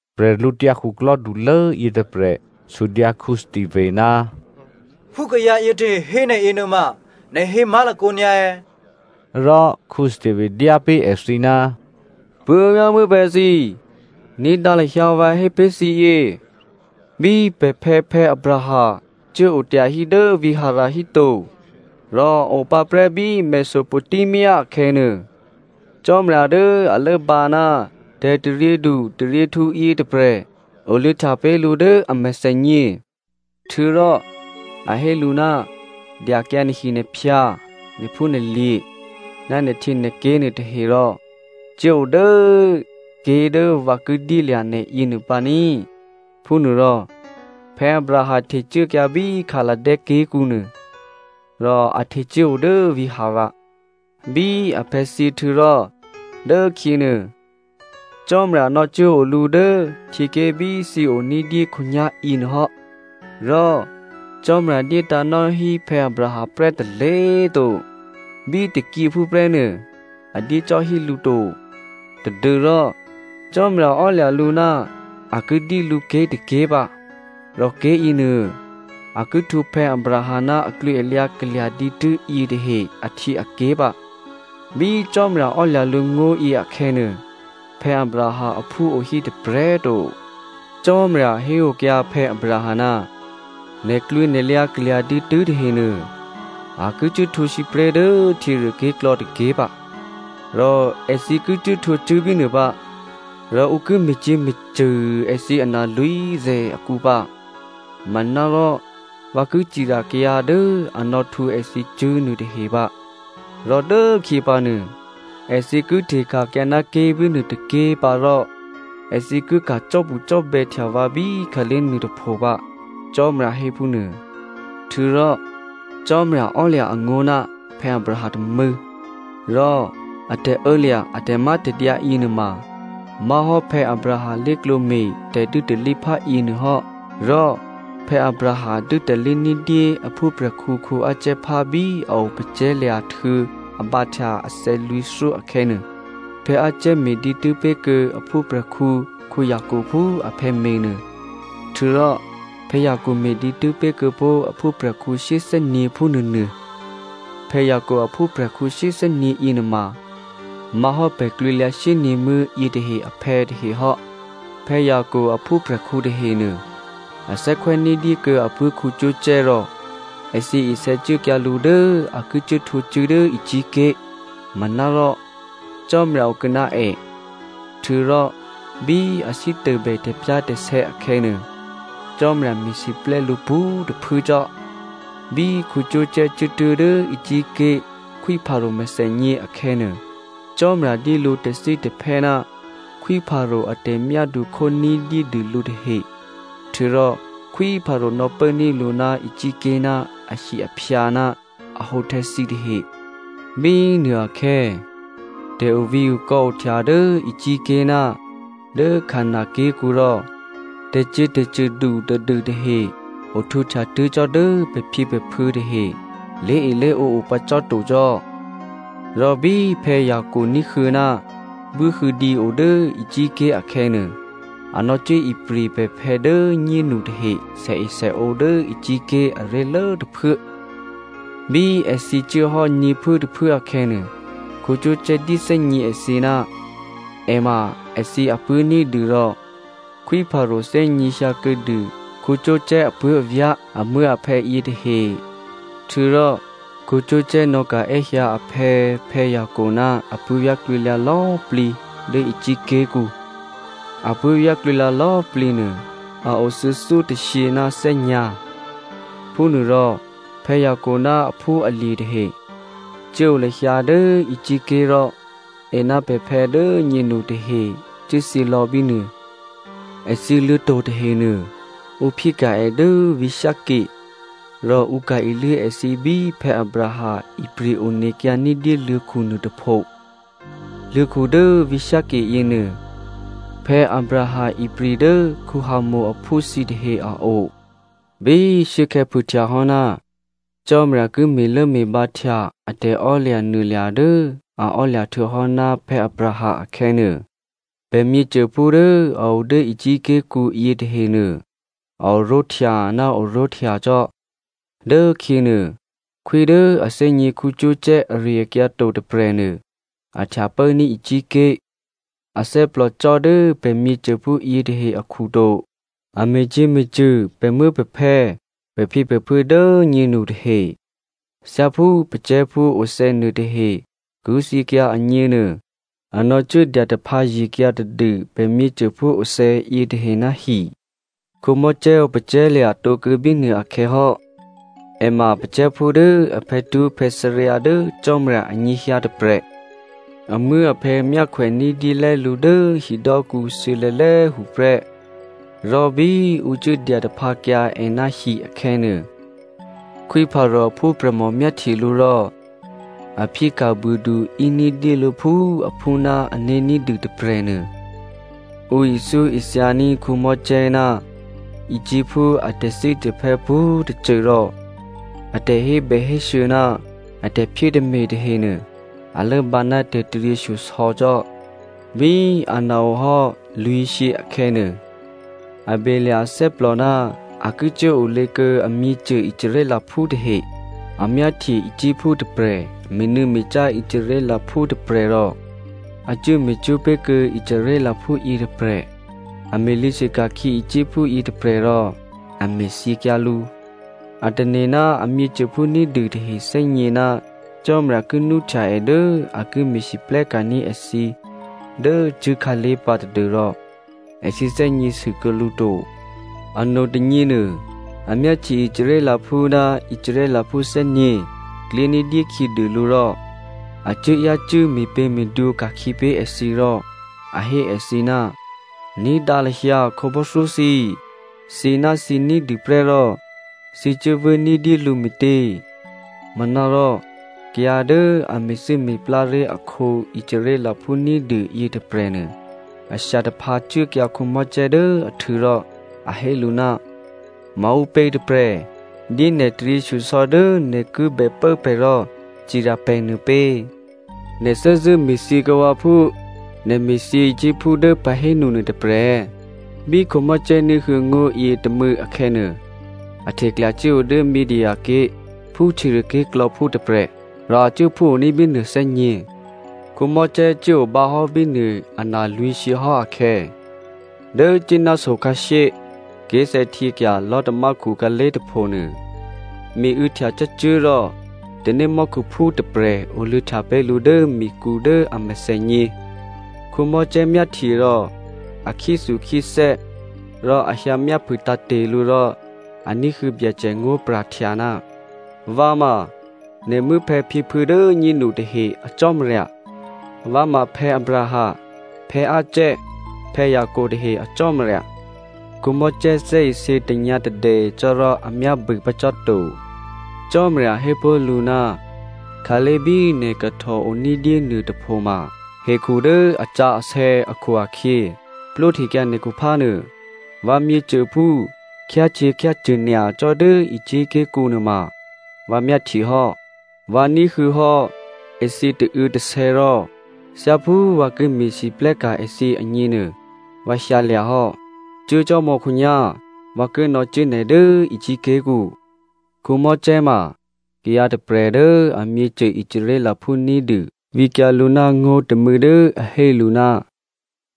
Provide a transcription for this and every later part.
Bwídukhulố yětôprè̤ sudyǎ Stephano, “Phú kayǎ yětahe hé nè̤ yěnuôma, nè̤ hé má̤lakǒ nyǎ è̌?” Rò Stephano dyá pé̤ èthǐ, “Puố̤vyá̤muố̤phè̌ thǐ꤮ ní̤dǎ lahyǎ vǎ hé pé̤ thǐ yě! Bí pè̤phè̌ Abraham cuốo tyahí dố vǐ̤ Haran híto, rò a opǎ prè́ bí Mesopotamia akhè̌nuô, Cò́marya dố a lốbǎ ná tè̤taryědu taryěhtǔ yětôprè̤ oluô̌htya pé̤ lǔ dố a mèthènyě. Htuô̌rò a hé lǔ, ‘Dyakyǎ nè̤hinè̤phyǎ, nè̤phúnè̤lye̤ ná nè̤htyěnè̤ké̤ nuôtahe rò cuố o dố ké̤ dố vǎ ki dyéluô̌ nè̤ yěnuô pǎ ní.’ “Phúnuôrò Abraham htecuốkyǎ bí Chaldea ké̤kǔ nuôrò a htecuốo dố vǐ̤ Haran. Bí aphè̌ thyěhtuô̌ rò dốkhyěnuô Cò́marya nò̌cuốo lǔ dố htyěké̤ bí thǐo ní̤dyé khǒnyá̤ yěnuôhò́. Rò Cò́marya dyétǎ̤ nò́hí Abraham prè́ tôlé̤꤮ to, bí tôkyěphú prè́nuô꤮ a dyé cò́ hí lǔ to, tadû́rò Cò́marya ò́lya̤ lǔ ná a ki dyé lǔ ké̤tôké̤ pǎ, rò ké̤yěnuô, a ki htwǒ Abraham ná aklwǐalyǎ kalya̤ dǐtû́ yětahe ahtyěaké̤ pǎ. Bí Cò́marya ò́lya̤ lǔ ngó̤yě akhè̌nuô, Abraham aphú o hí tôprè̤꤮ to. Cò́marya héokyǎ Abraham, ‘Nè̤klwǐnè̤lyǎ kalya̤ dǐtû́ tahenuô a ki cuốhtwǒ sǐpré̤ dố htyěruôké̤klò̌ tôké̤ pǎ, rò èthǐ ki cuốhtwǒ cṳ̂́ bínuô pǎ, rò ǔ ki me̤cyě̤me̤cṳ̂ èthǐ analwǐ̤zè̤ akǔ pǎ. Manárò vǎ ki cirya kayǎ dố a nò̌htwǒ èthǐ cṳ̂́ nuôtahe pǎ. Rò dốkhyěpǎnuô, èthǐ ki hteka̤kyǎ ná ké̤bínuô tôké̤ pǎ rò èthǐ ki ka̤ cò́bucò́bè̌htya vǎ bí khǎlé̤ nuôtôpho pǎ,’ Cò́marya hé phúnuô. Htuô̌rò Cò́marya ò́lya̤ angó̤ ná Abraham tômû̌, rò a tè̤ô̌lya̤ a tè̤mátè̤dyǎ yěnuôma má̤hò́ Abraham lé̤klǒ me̤ tè̤dû́talíphá yěnuô hò́. Rò Abraham dû́talí ní̤dyé a phúprè̤khǔ Isaac phá bí a opacè̤̌lya̤ htuô̌ a bǎhtya athè̌ lwǐ̤thyó akhè̌nuô. Isaac me̤ dǐtû́ pé̤kuô̌ a phúprè̤khǔ Jacob phú aphè̌ me̤nuô. Htuô̌rò Jacob me̤ dǐtû́ pé̤ kuô̌pó̤ a phúprè̤khǔ shyéthè́nyě̤ phúnuônuô. Jacob aphúprè̤khǔ shyéthè́nyě̤ yěnuôma má̤hò́ pè̤ klwǐlyǎ shyényě̤muố̤ yětahe aphè̌ tahe hò́. “Jacob aphúprè̤khǔ tahenuô, a thè́khwè́ ní̤dyé kuô̌ apuố̤ Joseph rò èthǐ isè̌cuốkyǎ lǔ dố a ki cuốhtwǒkyǎ cṳ̂́ dố Egypt ké̤. Manárò Cò́marya okuô̌ ná è. Htuô̌rò bí a sítôbè tè̤pyá̤tè̤sè̌ akhè̌nuô, Cò́marya me̤siplè́ lǔ pwǒ̤꤮ tôphuố cò́. Bí Joseph cuốtuố̤ dố Egypt ké̤ Khwí Pharao mèthènyě akhè̌nuô, Cò́marya dyé lǔ tè̤thítè̤phè́ ná Khwí Pharao a tè̤myádu khó ní̤dyédûlǔ tahe. Htuô̌rò Khwí Pharao nò̌pốní̤ lǔ ná Egypt ké̤ ná ahi-aphyǎ ná ahǒhtè̌ thǐtahe. “Bínuôakhè̌ tè̤ovǐ̤okò̌ ohtya dố Egypt ké̤ ná dố Canan ké̤kǔ rò tè̤cyě̤tè̤cṳ̂du tadû tahe ohtwǒhtya tuố̤ cò́ dố pè̤phyěpè̤phuô̌ tahe lé̤elé̤ǒ o pǎ cò́ to cò́. Rò bí Jacob ní̤huô̌ ná buốhuô̌dǐ o dố Egypt ké̤ akhè̌nuô, a nò̌cuố ipri̤ pè̤phè̌ dố꤮ nyénu tahe sèesèǒ dố Egypt ké̤ aré̤lố tôphuố. Bí èthǐ cuốhò́ nyě̤phuốtôphuố akhè̌nuô, Joseph dyéthè́gně èthǐ ná è ma èthǐ apuố̤ ní̤dû rò Khwí Pharao thè́gněhyǎ kuô̌dû Joseph apuố̤avyá̤, amuố̤aphè̌ yětahe. Htuô̌rò Joseph nò̌ka̤ è́hyǎ aphè̌ Jacob ná apuố̤vyá̤ klwǐlyǎ lò̌꤮ plǐ dố Egypt ké̤kǔ. Apuố̤vyá̤ klwǐlyǎ lò̌꤮ plǐ nuô, a o thuô̌thyótôshyě ná thè́nyǎ̤. Phúnuôrò Jacob ná aphúalye̤ tahe cuốo lahyǎ dố Egypt ké̤ rò è ná pè̤phè̌ dố꤮ nyénu tahe cuốthyělò̌ bínuô. Èthǐ luô̤̌to̤ tahenuô, ǔ phyéka̤ è dố vǐ̤ Shekem. Rò ǔ ka̤ iluố èthǐ bí Abraham ipri̤ onekyǎ ní̤dyé luô̤̌khu nuôtôpho. Luô̤̌khu dố vǐ̤ Shekem yěnuô Abraham ipri̤ dố Hamor aphú thǐtahe a o. “Bí shuốkhè̌ phûhtyahò́ ná Cò́marya ki me̤lốme̤bǎhtya a tè̤emaklò̤ dố a ò́lya̤ htuô̌hò́ ná Abraham akhè̌nuô, pè̤ myěcôphú dố a o dố Egypt ké̤kǔ yětahenuô, a oró̤htya ná oró̤htya cò́. Dốkhyěnuô, khwí dố a thè́gně Joseph ari-akyǎ to tôprè̤nuô, a htya pốní̤ Egypt ké̤. Athè́plò cò́ dố pè̤ myěcôphú yětahe akhu to. A me̤cyě̤me̤cṳ̂ pè̤muố̤pè̤phè̌, pè̤phyěpè̤phuô̌ dố꤮ nyénu tahe, thyáphú pacè̤̌phú othè̌ nuôtahe ki thyěkyǎ agněnuô a nò̌cuố dyataphǎye̤kyǎ tadû pè̤myěcô phúothè̌ yětahe ná hi. “Mosè opacè̤̌lya̤ tǒkuô̌ bínuôakhè̌ hò́. È ma pacè̤̌phú dố a phè̌twó̤phè̌thǎryǎ dố Cò́marya anyěhyǎ tôprè̤. Amuố̤aphè̌ myákhwè ní̤dyélè́ lǔ dố hidò́kǔ thuô̌lè̌lè̌꤮ tuô̌ prè́. Rò bí ǔ cuốdya taphǎkyǎ è ná hi akhè̌nuô, Khwí Pharao aphúprè̤mò myáhtye lǔ rò a phyéka̤ buôdu íní̤dyé lǔ phú aphú ná ané̤ ní̤dû tôprè̤nuô. Ǔ ithyóithyaní̤ Mosè ná Egyptphú a tè̤thítè̤phè́ pwǒ̤꤮ tôcô rò a tè̤hébèhésû̌ ná a tè̤phyétè̤me̤ tahenuô, a lốbǎ ná tè̤taryěshyosò̌ cò́. “Bí ana ohò́ lwǐ̤shyě akhè̌nuô, a belya̤ athè́plò ná a ki cuốolě kuô̌ amyěcô Israelphú tahe. A myáhtye Egyptphú tôprè̤ me̤nû̌me̤cá Israelphú tôprè̤ rò a cuố me̤cwó̤ pé̤kuô̌ Israelphú yětôprè̤. A me̤lyě̤sû ka̤khyě Egyptphú yětôprè̤ rò a me̤thyěkyǎ lǔ. A tane̤ ná a myěcôphú ní̤dû tahe thè́gně ná Cò́marya ki nwóhtya è dố a ki me̤lwóhteka̤ní̤ èthǐ dố cṳ̂́khǎlé̤ pǎ tadû́rò èthǐ thè́gněsû kuô̌ lǔ to. Anotônyěnuô, a myáhtye Israelphú ná Israelphú thè́nyě̤ klyé ní̤dyé khyědû lǔ rò a cuố yácû́ me̤pě̤me̤dwǒ ka̤khyě pé̤ èthǐ rò a hé èthǐ, ‘Ní̤dǎ lahyǎ khǒbò́thyó thǐ꤮ thǐnáthǐ ní̤dûprè́ rò thǐ cuố vû́ní̤dyé lǔ me̤tě?’ “Manárò kayǎ dố a me̤thû́me̤plá ré̤ akhǒ Israelphú ní̤dû yětôprè̤nuô, a shya taphǎ cuốkyǎ Mosè dố ahtû̌ rò a hé lǔ, ‘Maǔpě tôprè̤ dyé nè̤ taryěshyosò̌ dố nè̤ kibè pố pè̤ rò cirya pè̤ nuôpě? Nè̤ thè́zṳ̂́ me̤thyěkuô̌ vǎ phú nè̤ me̤thyě Egyptphú dố pahénu nuôtôprè̤ è̌?’ Bí Mosè ní̤huô̌ ngó̤ yětômû̌ akhè̌nuô, a hteklya cuốo dố Midia ké̤ phú htyěruôké̤klò̌phú tôprè̤, rò a cuố phúoní̤ bínuô thè́nyě̤. “Mosè cuốo bǎhò́ bínuô analwǐ̤shyě hò́ akhè̌, dố Sínai so khǎshyé, ké̤sè̌htyěkya̤ lò̤́tamákhu khǎlé̤ tôphonuô, miû̌htya cǎcuố̤ rò tanémò́khuphú tôprè̤ oluô̌htya pé̤ lǔ dố mikǔ dố a mèthènyě. Mosè myáhtye rò a khyéthukhyéthè́ rò a hyǎmyáphû tǎ̤te̤ lǔ rò a ní̤huô̌ Byacè ngó̤pra̤htya, ‘Vǎ ma nè̤ muố̤phè̌phyěphuô̌ dố꤮ nyénu tahe a Cò́marya. Vǎ ma Abraham, Isaac, Jacob tahe a Cò́marya.’ Mosè thè́isě tanyǎ̤tadè cò́ rò a myábû pǎ cò́ to. “Cò́marya hé pó̤ lǔ, ‘Khǎlé̤ bí nè̤ kahtòo ní̤dyé nuôtôpho ma hekhu dố asǎsè̌ akhu-akhyě plwóhtekyǎ nè̤khuphá nuô. Vǎ myěcôphú khyácyě̤khyácṳ̂ nyacò́ dố Egypt ké̤kǔ nuôma vǎ myáhtye hò́. Vǎ ní̤huô̌hò́ èthǐ tauô̌tasè̌ rò thyáphú vǎ ki me̤lwóhteka̤ èthǐ agněnuô, vǎ hyǎlya̤ hò́. Cuốcò́mò̌ khǒnyá̤, vǎ ki nò̌cuố nè̤ dố Egypt ké̤kǔ.’ “Mosè ma kayǎ tôprè̤ dố amyěcô Israelphú ní̤dû vǐkyǎ lǔ ná ngó̤ tômû̌ dố a hé lǔ,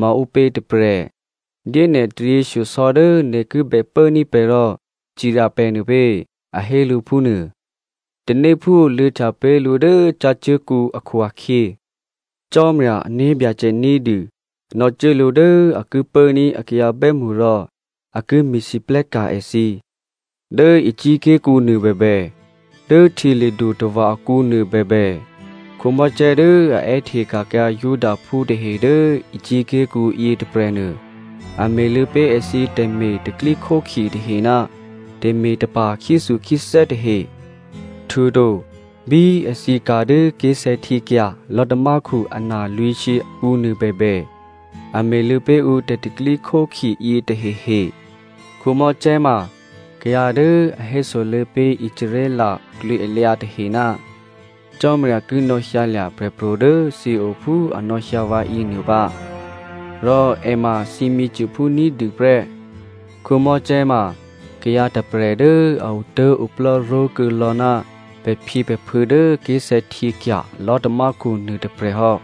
‘Maǔpě tôprè̤ dyé nè̤ taryěshyosò̌ dố nè̤ ki bèpốní̤ pè̤ rò cirya pè̤ nuô pě?’ A hé lǔ phúnuô. Tanéphú oluô̌htya pé̤ lǔ dố cǎcuố̤kǔ akhu-akhyě, Cò́marya ané̤byacè ní̤dû nò̌cuố lǔ dố a ki pốní̤ a kayǎ bè́mṳ rò a ki me̤lwóhteka̤ èthǐ. Dố Egypt ké̤kǔ nuô bèbè, dố Htyěli̤dutava̤ akǔnuô bèbè, Mosè dố a è́hteka̤kyǎ Judaphú tahe dố Egypt ké̤kǔ yětôprè̤nuô, a me̤luô̌ pé̤ èthǐ tè̤me̤ tè̤pro̤tè̤prya̤ tahe ná tè̤me̤tapa̤ khyéthukhyéthè́ tahe. Htuô̌to bí èthǐ ka̤ dố ké̤sè̌htyěkya̤ lò̤́tamákhu ana lwǐ̤shyě akǔnuô bèbè, a me̤luô̌ pé̤ ǔ tè̤pro̤tè̤prya̤ yětahehe. “Mosè ma kayǎ dố a hésoluô̌ pé̤ Israel aklwǐalyǎ tahe, ‘Cò́marya ki nò̌hyǎlya̤ prè̤pro̤ dố thǐo phú a nò̌hyǎ vǎ yěnuô pǎ, rò è ma thǐ myěcôphú ní̤dû prè́.’ Mosè ma kayǎ tôprè̤ dố a otố̤oplò́ ró̤kuô̌ lò̌ ná pè̤phyěpè̤phuô̌ dố ké̤sè̌htyěkya̤ lò̤́tamákhu nuôtôprè̤ hò́.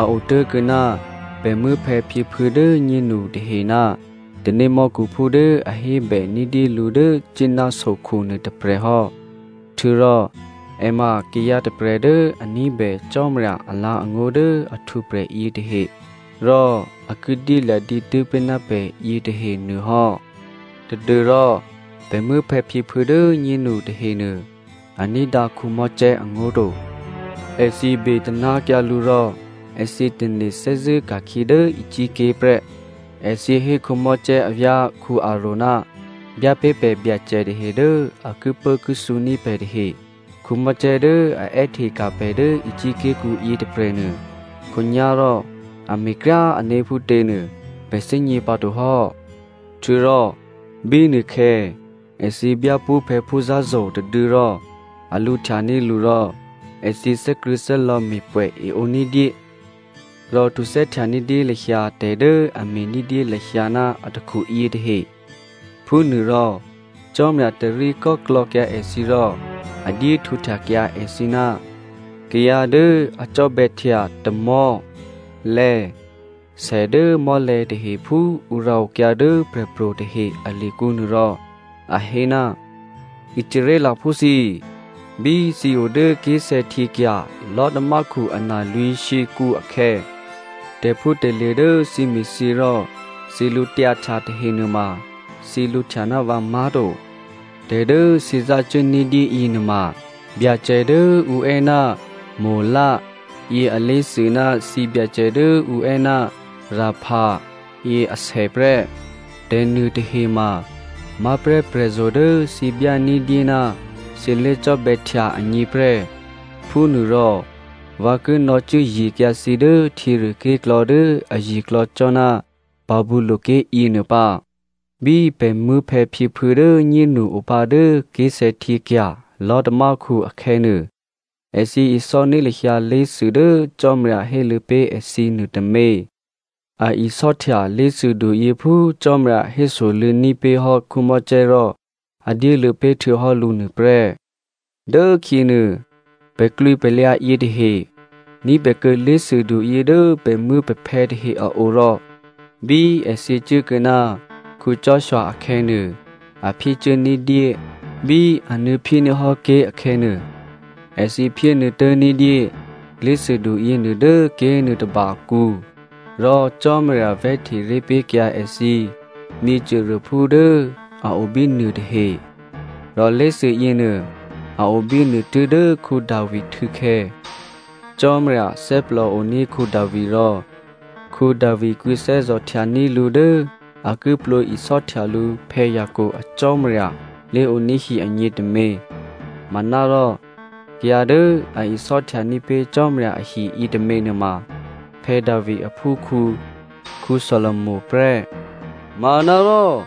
A otố̤kuô̌ ná pè̤ muố̤phè̌phyěphuô̌ dố꤮ nyénu tahe ná tanémò́khuphú dố a hébè ní̤dyé lǔ dố Sínai sokhu nuôtôprè̤ hò́. Htuô̌rò è ma kayǎ tôprè̤ dố a ní̤bè Cò́marya alǎ̤angó̤ dố a htwǒprè̤ yětahe rò a ki dyélya̤ dǐtû́ pé̤ ná pè̤ yětahe nuô hò́. “Tadû́rò pè̤ muố̤phè̌phyěphuô̌ dố꤮ nyénu tahenuô, a ní̤dǎ Mosè angó̤ to. Èthǐ betaná̤kyǎ lǔ rò èthǐ tane̤ thè́zṳ̂́ ka̤khyě dố Egypt ké̤ prè́. Èthǐ hé Mosè avyá̤ Aròn, ‘Byá pé̤ pè̤ byacè tahe dố a kipốkithǔ ní̤ pè̤ tahe! Mosè dố a è́hteka̤ pè̤ dố Egypt ké̤kǔ yětôprè̤nuô, khǒnyá̤rò a me̤kryá꤮ ané̤ phútě nuô, pè̤ thè́gně pǎto hò́!’ Htuô̌rò bínuôkhè̌ èthǐ byá pṳ́phè̌phú zǎ̤zo̤ tôduô̌ rò a lǔhtyaní̤ lǔ rò èthǐ thè́krṳ̂̌thè́lò̌ me̤pwè̌ eǒ ní̤dyé, rò htuthè́htya ní̤dyé lahyǎ tè̤ dố a me̤ ní̤dyé lahyǎ ná atakhu yětahe. Phúnuôrò Cò́marya tarí kò́klò̌kyǎ èthǐ rò a dyéhtwǒhtyakyǎ èthǐ ná kayǎ dố a cò́bè̌htya tamò̤́, lè̌, sè dố mò́lè̤̌ tahe phú ǔ rǎokyǎ dố prè̤pro̤ tahe alikǔ nuô rò a hé, ‘Israelphú thǐ꤮! Bí thǐ o dố ké̤sè̌htyěkya̤ lò̤́tamákhu analwǐ̤shyěkǔ akhè̌, tè̤phútè̤lye̤ dố thǐ me̤thyě rò thǐ lǔtyǎhtya tahe nuôma thǐ lǔhtya ná vǎ má̤to. Tè̤ dố thǐ zácuố ní̤dyé yěnuôma byacè dố ǔ è́ ná Molo yě alé̤thû ná thǐbyacè dố ǔ è́ ná Repha yě asè prè́. Tè̤nuôtahe ma má̤prè́ prè̤zo̤ dố thǐ byá ní̤dyé ná thǐ lé̤cò́bè̌htya agněprè́. Phúnuôrò vǎ ki nò̌cuốye̤kyǎ thǐ dố htyěruôké̤klò̌ dố aye̤klò̌ cò́ ná Babylonia ké̤ yěnuô pǎ.’ “Bí pè̤ muố̤phè̌phyěphuô̌ dố꤮ nyénu opǎ dố ké̤sè̌htyěkya̤ lò̤́tamákhu akhè̌nuô, èthǐ isò́ní̤ lahyǎ lé̤thû dố Cò́marya héluô̌ pé̤ èthǐ nuôtômě. A isò́htya lé̤thûduyě phú Cò́marya hésoluô̌ní̤ pé̤hò́ Mosè rò a dyéluô̌ pé̤htuô̌hò́ lǔ nuôprè́. Dốkhyěnuô pè̤klwǐpè̤lyǎ yětahe ní̤bèkuô̌ lé̤thûduyě dố pè̤muố̤pè̤phè̌ tahe a o rò bí èthǐ cuốkuô̌ ná Joshua akhè̌nuô, a phyécuố ní̤dyé. Bí a nuô̌phyéní̤ hò́ ké̤ akhè̌nuô, èthǐ phyénuô̌tố̤ ní̤dyé lé̤thûdu yěnuô dố ké̤nuôtôba akǔ. Rò Cò́marya vè̤́hteré̤ pé̤kyǎ èthǐ myěcôruôphú dố a o bínuô tahe rò lé̤thû yěnuô a o bínuô tuố̤dố Davi htû̌khè̌. Cò́marya thè́plòoní̤ Davi rò Davi kwǐthè́zò̤ htyaní̤ lǔ dố a ki plwǒ isò́htya lǔ Jacob a Cò́marya lé̤oní̤hi agně tômě. Manárò kayǎ dố a isò́htyaní̤ pé̤ Cò́marya ahi yětômě nuôma Davi aphúkhǔ Solomo prè́. “Manárò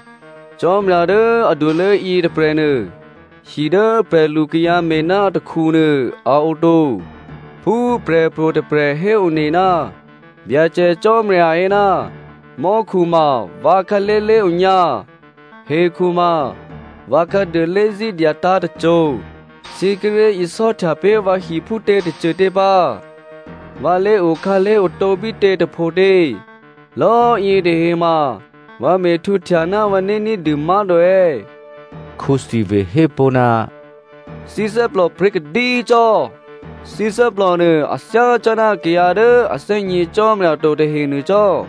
Cò́marya dố adulố yětôprè̤nuô hi dố prè̤lukayǎ me̤ ná atakhu nuô a oto. Phú prè̤pro̤ tôprè̤ héone ná Byacè Cò́marya hé, ‘Mò́khu ma vǎ khǎlé̤ lé̤onyǎ. Hekhu ma vǎ khǎduô lé̤zí̤ dyatǎ̤ tôcô. Thǐ kíré̤ isò́htya pé̤ vǎ hi phútě tôcôtě pǎ? Vǎ lé̤okhǎlé̤ otǒ bítě tôphotě? Lò̌꤮ yětahe ma vǎ me̤htwǒhtya ná vǎné̤ ní̤dû má̤to è̌?’” Stephano hé pó̤, “Thǐ thè́plò pryě̤kadí cò́! Thǐ thè́plònuô a thyácò́ná kayǎ dố a thè́gně Cò́marya to tahe nuô cò́!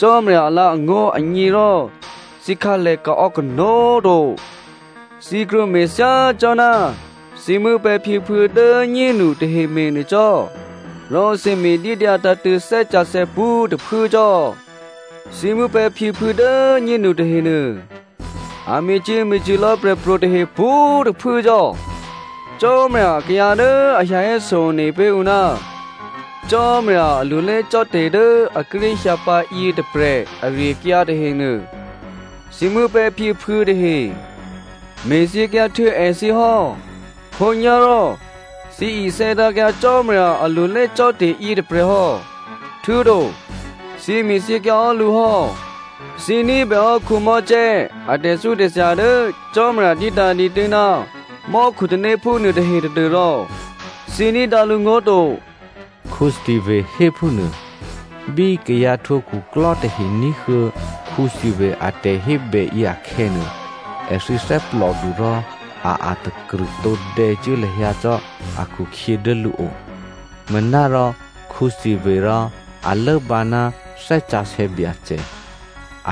Cò́marya alǎ̤angó̤ agně rò thǐ khǎlèkaò̌ kanó̤꤮ to! Thǐ krwǒme̤ thyácò́ná thǐ muố̤phè̌phyěphuô̌ dố꤮ nyénu tahe me̤nuô cò́, rò thǐ me̤dídyǎ tǎ̤tṳ̂̌ Thè́ Sǎsè̌ pwǒ̤꤮ tôphuố cò́! Thǐ muố̤phè̌phyěphuô̌ dố꤮ nyénu tahenuô, a me̤cyě̤me̤cṳ̂ lò̌ prè̤pro̤ tahe pwǒ̤꤮ tôphuố cò́. Cò́marya akayǎ dố a hyǎ héso one pé̤ ǔ ná Cò́marya alulé cò́te̤ dố a kíré̤ hyǎ pǎ yětôprè̤ ari-akyǎ tahenuô, thǐ muố̤phè̌phyěphuô̌ tahe me̤thyěkyǎ htuô̌ èthǐ hò́. Khǒnyá̤rò thǐ isè̌tǎ̤kyǎ Cò́marya alulé cò́te̤ yětôprè̤ hò́, htuô̌to thǐ me̤thyěkyǎ hò́ lǔ hò́. Thǐ ní̤bèhò́ Mosè a tè̤thyótè̤thya dố Cò́marya dyétǎ̤ dǐtû́ ná mò́khutanéphú nuôtahe tadû́rò thǐ ní̤dǎ lǔngó̤ to,” Stephano hé phúnuô. Bí kayǎ htwǒ khuklò́ tahe ní̤huô̌ Stephano a tè̤hébèyě akhè̌nuô, èthǐ thè́plòdu rò a a̤takrṳ̂ tǒdè̌cuố lahyǎ cò́ akhukhyě dố lǔo. Manárò Stephano rò, a lốbǎ ná Thè́ Sǎsè̌ Byacè.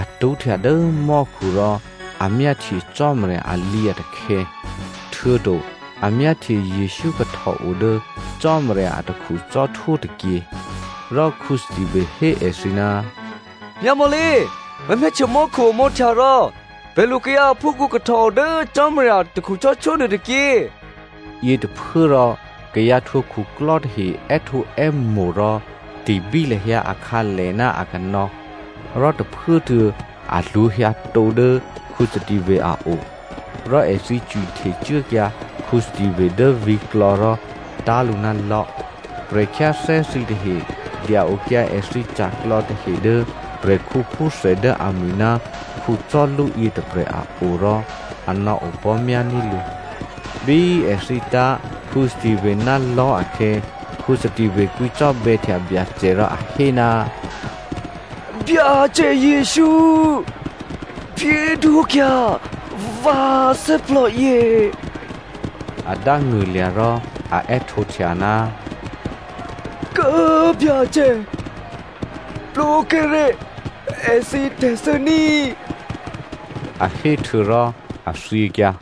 A tṳ́htya dố mò́khu rò a myáhtye Cò́marya alǐatakhè̌, htuô̌to a myáhtye Jesǔ kahtòo dố Cò́marya atakhu cò́htwó tôkyě. Rò Stephano hé èthǐ, “Myámò̌lé꤮! Vǎ myáhtye mò́khu omǒhtya rò prè̤lukayǎ aphúkhǔ kahtòo dố Cò́marya atakhu cò́htwó nuôtôkyě.” Yětôphuốrò kayǎ htwǒ khuklò́ tahe è́htǒè́mo̤ rò ti̤bí lahyǎ akhǎlè ná akanò̌. Rò tôphuốtuô̌ a lwǒ̤ hyǎtǒ dố Stephano a o. Rò èthǐ cwihtecuốkyǎ Stephano dố vǐ̤klò̌ rò tá̤ lǔ ná lò̤́. Prè̤khyáthè́ thǐtahe dya-okyǎ èthǐ ca̤klò̌ tahe dố prè̤khǔphúthè dố amwi̤ ná Saulu yětôprè̤ a o rò a nò̌opò̤́myání̤ lǔ. Bí èthǐ tá̤ Stephano ná lò̤́ akhè̌, Stephano kwǐcò́bè̌htya Byacè rò a hé, “Byacè Jesǔ꤮, phyédwókyǎ vǎ thè́plò yě.” A dángṳ̂lya̤ rò a è́htǒhtya, “Kố꤮ Byacè, plwǒkyǎré̤ èthǐ tè̤thû́ ní꤮” a hé htuô̌rò a thyěkyǎ.